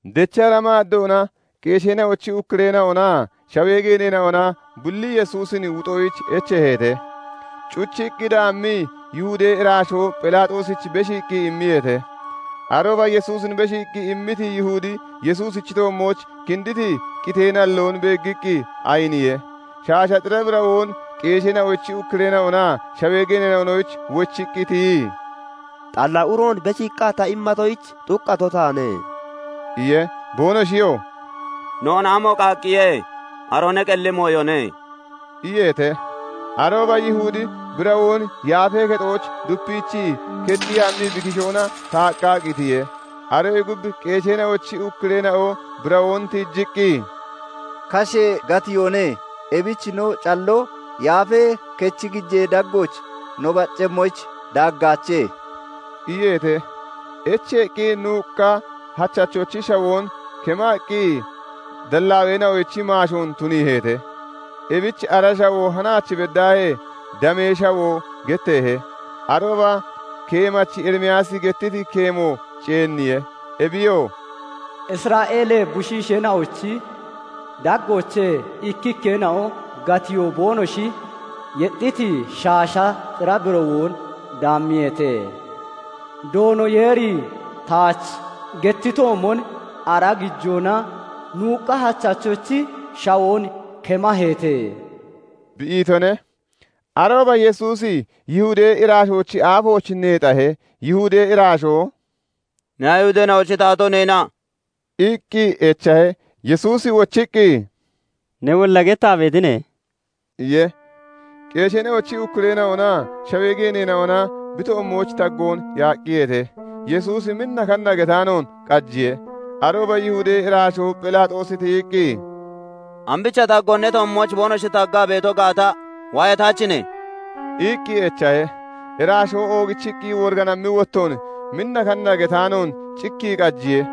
Dechra maaddoona qeesheena'ochi ukkureena'onaa shawee geeneena'ona bulli Yesuusin wuxoyich echeeheete. Cuchiqqi daammii Yihudee iraashoo Phelaaxoosich beshiiqqi immiyeete. Arooba Yesuusin beshiiqqi immiti Yihudi Yesuusichi toommooch kinditi qitee nalloon beeggiqqi ayiniye; shaasha xira birawoon qeesheena'ochi ukkureena'onaa shawee geeneena'onoyich wochiqqi tiyii, "Xalla uroon beshiiqqa ta immatoyich, xuqqato taane" iye. Boonoshiyoo "Noon amo qaaqqiye? Aroo ne qelli mooyone" iyeete. Arooba Yihudi birawoon yaafee kexooch dupiichii kechii hammii bi kishoona taaqqa qitiye. Aroyee gub qeesheena'ochi ukkureena'o birawoon tiijiqqi, "Kashee gatiyoone; ebichi no calloo Yaafee Kechi gijee daggooch no baccemmoyich daaggaache" iyeete. Echeeqqi nuuqqa hachachochi shawoon kemaqqi dallaaweena'oyich maashoon tuniiheete. Ebich ara shawoo hanaach beddaahee "Damee shawoo" getteehe. Arooba keemachi Erimiyaasi gettiti keemo ceenniye; ebiyoo "Isra'eelee bushiisheena'ochi daggoochee ikkikkeena'o gatiyoo boonoshi yexxiti shaasha xira birawoon daammiyeete; Doono Yeeri taach gettitoomon, ara gijoona nuuqqa hachachochi shawoon kemaheete" bi itone. Arooba Yesuusi Yihudee iraashoochi aafooch neexahe; Yihudee iraashoo "Ne Ayihudeena'ochi taatoo neena?" iqqi echahe. Yesuusi wochiqqi, "Newolla gettaa beetine" iye. Qeesheena'ochi ukkureena'onaa shawee geeneena'ona bi toommooch taggoon yaaqqiyeete; Yesuusi minna kanna getaanoon qajiye. Arooba Yihudee iraashoo Phelaaxoosi tiyiqqi, "Ambicha taggoon ne toommooch boonoshi taggaa beeto gaata waayataachine?" iqqi echahe. Iraashoo oogichiqqi woriganammi wottoon minna kanna getaanoon cikkii qajiye.